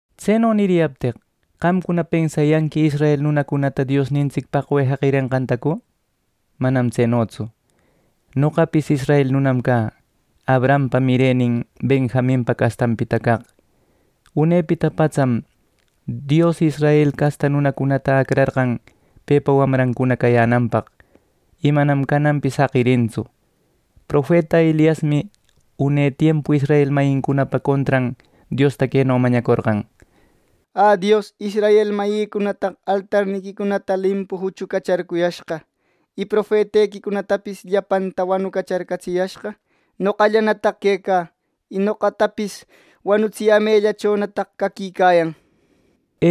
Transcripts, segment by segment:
Tseno niriyapteq, qamcuna pensayanqui, ¿Israel nunancunata Diosnintsic paqwe jaqirenqantacu? ¡Manam tsenotsu! Noqapis israel nunam cä, Abrahampa mirenin, Benjaminpa castanpita caq. Unepita patsam Dios israel casta nunacunata acrarqan pepa wamrancuna cayänanpaq y manam cananpis jaqirintsu. Profeta Eliasmi une tiempu israel mayincunapa contran, Diosta queno mañacorqan: “¡Ä, Dios! Israel mayïcunataq altarniquicunata limpu juchucacharcuyashqa y profetequicunatapis ¡llapantam wanucacharcatsiyashqa! ¡Noqallanataq quecä, y noqatapis wanutsiyämellachonataq caquicayan!” nir.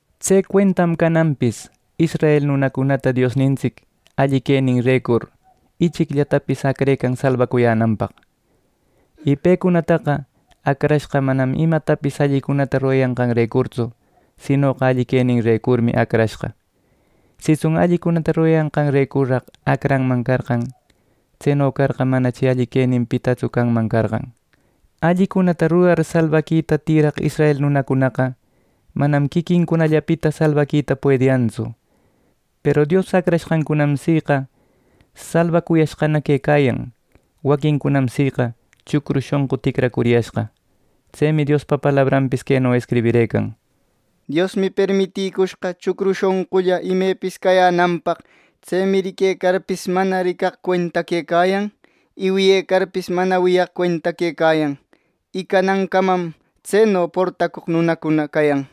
Tse cuentam cananpis israel nunacunata Diosnintsic alli queninrecur ichicllatapis acrecan salbacuyänanpaq. Y pecunataqa acrashqa manam imatapis allicunata rurayanqanrecurtsu sinoqa alli queninrecurmi acrashqa. Sitsun allicunata rurayanqanrecurraq acranman carqan, tseno carqa manachi alli queninpitatsu canman carqan. Allicunata rurar salbaquita tïraq israel nunacunaqa manam quiquincunallapita salbaquita puediyantsu. Peru Dios acranqancunam siqa salbacushqana quecayan. Waquincunam siqa chucru shonqu ticracuriyashqa. Tsemi Diospa palabranpis queno escribirëcan: “Diosmi permitïcushqa chucru shonqulla imepis cacuyänanpaq. Tsemi riquecarpis, mana ricaq cuenta quecayan; y wiyecarpis, mana wiyaq cuenta quecayan; y canancaman tseno portacoq nunacuna cayan” nir.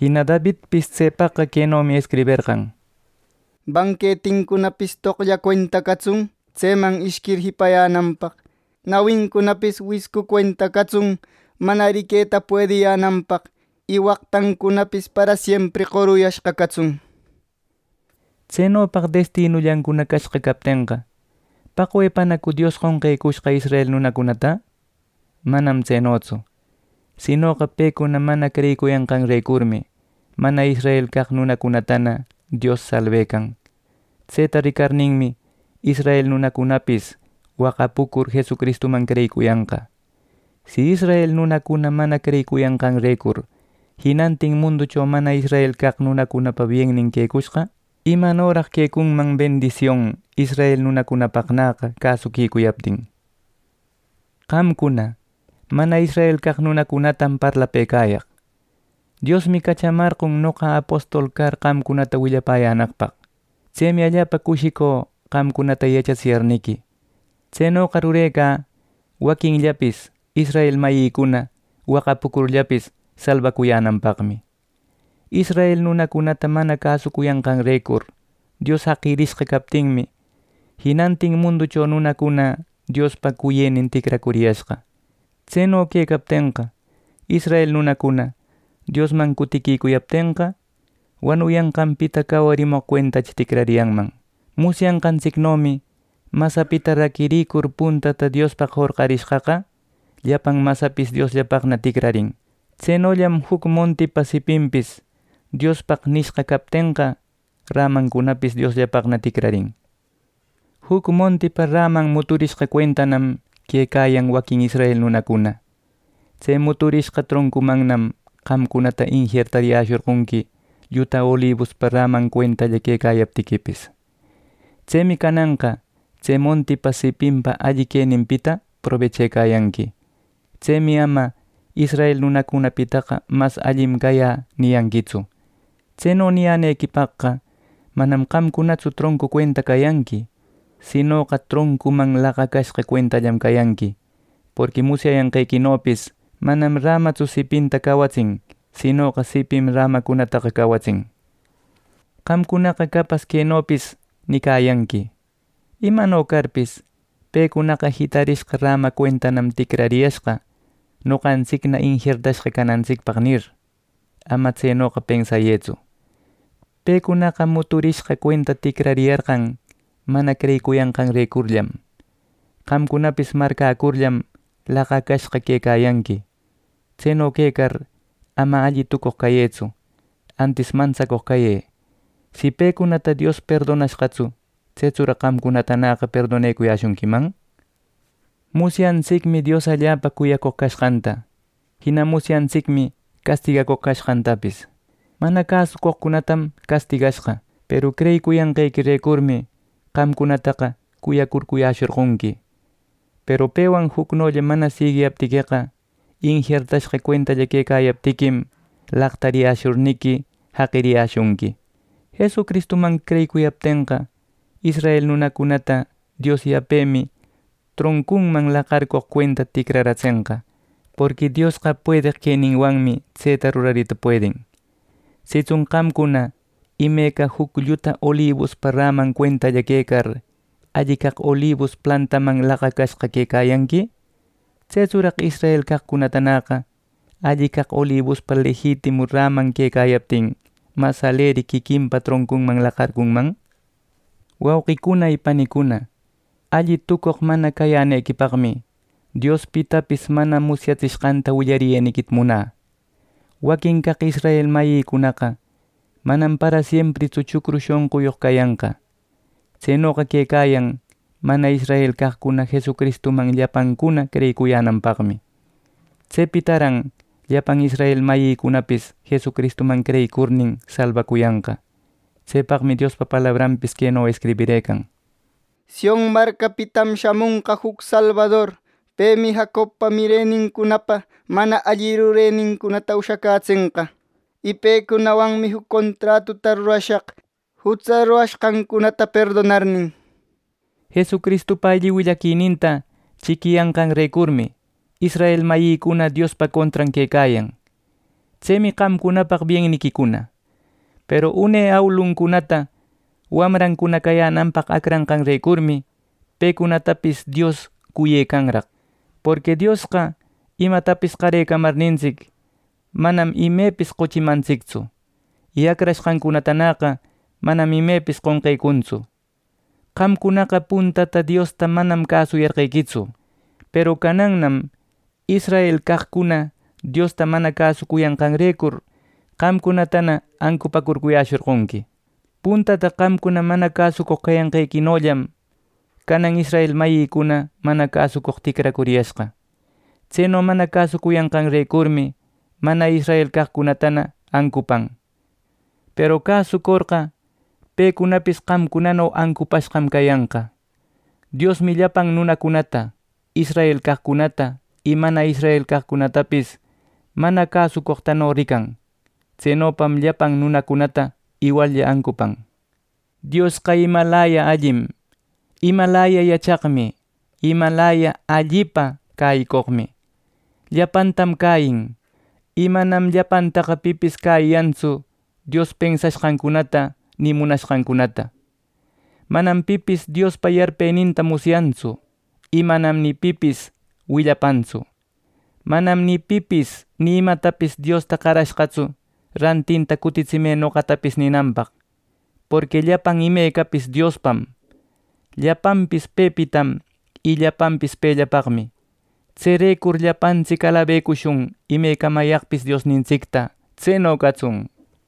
Jina Davidpis tsepaqqa quenomi escriberqan: “Banquetincunapis toqlla cuenta catsun, tseman ishquir jipayänanpaq. Nawincunapis wiscu cuenta catsun, mana riqueta puediyänanpaq y waqtancunapis parasiempri qoruyashqa catsun” nir. Tsenopaq destinullancuna cashqa captenqa, ¿paqwepanacu Dios qonqecushqa israel nunacunata? Manam tsenotsu. Sinoqa pecuna mana creyicuyanqanrecurmi mana israel caq nunacunatana Dios salbecan. Tseta ricarninmi, israel nunacunapis waqapucur Jesucristuman creyicuyanqa. Si israel nunacuna mana creyicuyanqanrecur jinantin munducho mana israel nunacunapa biennin quecushqa; ¿Imanoraq quecunman bendision israel nunacunapaqnäqa cäsuquicuyaptin! Qamcuna, mana israel caq nunacunatam parlapëcayaq. Diosmi cachamarqon noqa apostol car qamcunata willapäyänaqpaq. Tsemi allapa cushicü qamcunata yachatsiyarniqui. Tsenoqa rurecä waquinllapis israel mayïcuna waqapucurllapis salbacuyänanpaqmi. Israel nunacunata mana cäsucuyanqanrecur Dios jaqirishqa captinmi, jinantin munducho nunacuna Diospa cuyënin ticracuriyashqa. Tseno quecaptenqa, israel nunacuna Diosman cutiquicuyaptenqa, wanuyanqanpita cawarimoq cuentachi ticrariyanman. Musyanqantsicnomi masapita raquircur puntata Diospaq jorqarishqaqa, llapan masapis Diosllapaqna ticrarin. Tsenollam juc montipa sipinpis Diospaq nishqa captenqa, rämancunapis Diosllapaqna ticrarin. Juc montipa räman muturishqa cuentanam quecayan waquin israel nunacuna. Tse muturishqa troncumannam qamcunata injertariyäshorqonqui lluta olibuspa räman cuentalla quecayaptiquipis. Tsemi cananqa tse montipa sipinpa alli queninpita probechayanqui. Tsemi ama “israel nunacunapitaqa mas allim cayä” niyanquitsu. Tseno niyänequipaqqa manam qamcunatsu troncu cuenta cayanqui; sinoqa troncuman laqarishqa cuentallam cayanqui. Porqui musyayanqequinopis manam rämatsu sipinta cawatsin sinoqa sipim rämacunataqa cawatsin. Qamcunaqa capas quenopis nicayanqui: “Imano carpis, pecunaqa jitarishqa räma cuentanam ticrariyashqa, noqantsicna injertashqa canantsicpaq” nir. Ama tsenoqa pensayëtsu. Pecunaqa muturishqa cuenta ticrayarqan mana creyicuyanqanrecurllam. Qamcunapis marcäcurllam, laqacashqa quecayanqui. Tseno quecar ama alli tucoq cayëtsu, antis mantsacoq cayë. Si pecunata Dios perdonashqatsu, ¿tsetsuraq qamcunatanäqa perdonecuyäshunquiman! Musyantsicmi Dios allapa cuyacoq cashqanta, jina musyantsicmi castigacoq cashqantapis. Mana cäsucoqcunatam castigashqa; peru creyicuyanqequirecurmi qamcunataqa cuyacurcuyäshorqonqui. Peru pewan jucnolla mana siguiyaptiqueqa, injertashqa cuentalla quecayaptiquim laqtariyäshurniqui jaqiriyäshunqui. Jesucristuman creyiquicuyaptenqa, israel nunacunata Dios yapemi troncunman laqarcoq cuenta cutircatsenqa. Porqui Diosqa puedeq queninwanmi tseta rurarita puedin. Sitsun qamcuna imeca juc lluta olibuspa räman cuentalla quecar, alli caq olibus plantaman laqacashqalla quecayanqui; tsetsuraq israel caqcunatanäqa alli caq olibuspa lejitimu räman quecayaptin mas aleri quiquinpa troncunman laqarcunman. Wauqicuna y panicuna, alli tucoq mana cayänequipaqmi Dios pitapis mana musyatsishqanta willariyeniquita munä: Waquin caq israel mayïcunaqa manam parasiempritsu chucru shonquyoq cayanqa. Tsenoqa quecayan mana israel caqcuna Jesucristuman llapancuna creyiquicuyänanpaqmi. Tsepitaran llapan israel mayïcunapis Jesucristuman creyicurnin salbacuyanqa. Tsepaqmi Diospa palabranpis queno escribirëcan: “Sion marcapitam shamonqa juc salbador, Pemi Jacobpa mirenincunapa mana alli rurenincunata ushacätsenqa” nir. “Y pecunawanmi juc contratuta rurashaq, jutsa rurashqancunata perdonarnin” Jesucristupa alli willaquininta chiquiyanqanrecurmi, israel mayïcuna Diospa contran quecayan. Tsemi qamcunapaq bienniquicuna. Peru une awiluncunata wamrancuna cayänanpaq acranqanrecurmi pecunatapis Dios cuyecanraq. Porqui Diosqa imatapis qarecamarnintsic, manam imepis qochimantsictsu. Y acrashqancunataqa manam imepis qonqecuntsu. Qamcunaqa puntata Diosta manam cäsucuyarqequitsu. Peru canannam israel caqcuna Diosta mana cäsucuyanqanrecur qamcunatana ancupäcurcuyäshorqonqui. Puntata qamcuna mana cäsucoq cayanqequinollam canan israel mayïcuna mana cäsucoq ticracuriyashqa. Tseno mana cäsucuyanqanrecurmi mana israel caqcunatana ancupan; peru cäsucorqa pecunapis qamcunano ancupashqam cayanqa. Diosmi llapan nunacunata israel caqcunata y mana israel caqcunatapis mana cäsucoqtano rican. Tsenopam llapan nunacunata iwallla ancupan. ¡Diosqa imalaya allim, imalaya yachaqmi y imalaya allipa cäyicoqmi! Llapantam cäyin. Y manam llapantaqa pipis cäyiyantsu, Dios pensashqancunata ni munashqancunata. “Manam pipis Diospa yarpeninta musyantsu. Y manam ni pipis willapantsu.” “Manam ni pipis ni imatapis Diosta qarashqatsu ‘Rantinta cutitsimë noqatapis’ ninanpaq.” Porqui llapan imecapis Diospam. Llapanpis pepitam y llapanpis pellapaqmi. ¡Tserecur llapantsic alabecushun imecamayaqpis Diosnintsicta! ¡Tseno catsun!